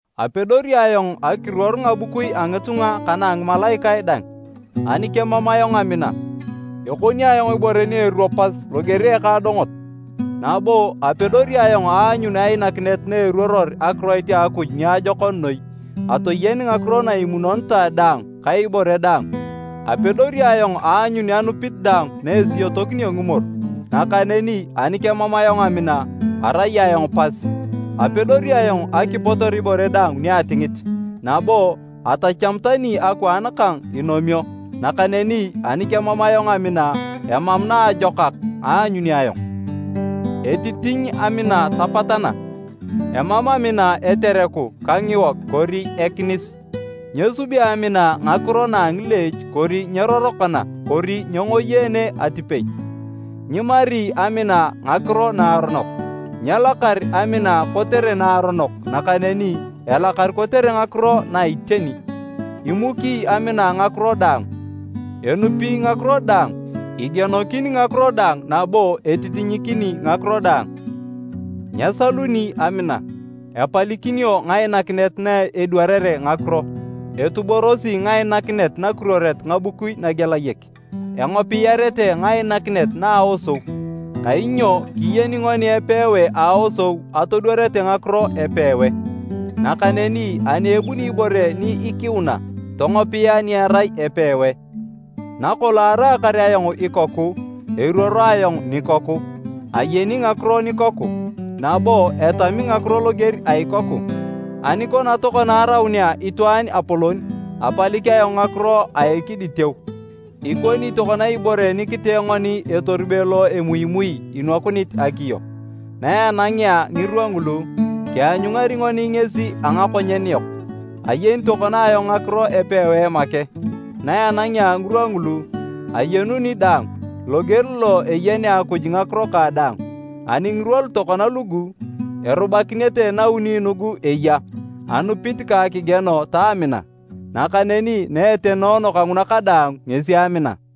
Apedori ayong akiruor ngabukui a ngitunga ka na a ngimalaikae dang, ani kemam ayong amina, ekoni ayong ibore ni eruo pas loger a ekaadongot. Nabo, apedori ayong aanyun ainakinet na eruoror akiroit a Akuj niajokon noi, atoyen ngakiro na imunonitae daang ka ibore daang. Apedori ayong aanyun anupit daang na esiyotokinio ngimoru, nakaneni ani kemam ayong amina, arai ayong pas. Apedori ayong akipotor ibore daang ni atingit, nabo atacham tani akwaan kang inomio, nakaneni ani kemam ayong amina, emam naajokak aanyuni ayong. Etitiny amina tapatana, emam amina etereku ka ngiwog kori ekinis, nyesubi amina ngakiro na a ngileech kori nyerorokana kori nyengoyeene atipei, nyimari amina ngakiro naaronok. Nyelakar amina kotere naaronok nakaneni elakar kotere ngakiro na a iteni. Imuki amina ngakiro daang, enupi ngakiro daang, igienokin ngakiro daang nabo etitinyikini ngakiro daang. Nyesaluni amina. Epalikinio ngainakinet na edwarere ngakiro. Etuborosi ngainakinet nakiruoret ngabukui nagelayek. Engopiyarete ngainakinet na a aosou. Kainyo kiyeni ngoni epewae a aosou atodwarete ngakiro epewae, nakaneni ani ebuni ibore ni ikiuna, tongopia ni erai epewae. Nakolong araakar ayong ikoku, eruoro ayong nikoku, ayeni ngakiro nikoku, nabo etami ngakiro loger a ikoku. Ani kona tokona araunea itwaan apolon, apalik ayong ngakiro a ekiditeu. Ikoni tokona ibore ni kitee ngoni etorube lo emuimui inwakunit akiyo, na enangea ngirwa ngulu, kianyungari ngoni ngesi a ngakonyen yok. Ayeni tokona ayong ngakiro epewae make, na enangea ngirwa ngulu, ayenuni daang, loger lo eyenea Akuj ngakiro kang daang. Ani ngirwa lu tokona lugu, erubakinete nauni nugu eya, anupit ka akigieno ta amina, nakaneni na etenoono kanguna kadaang ngesi amina.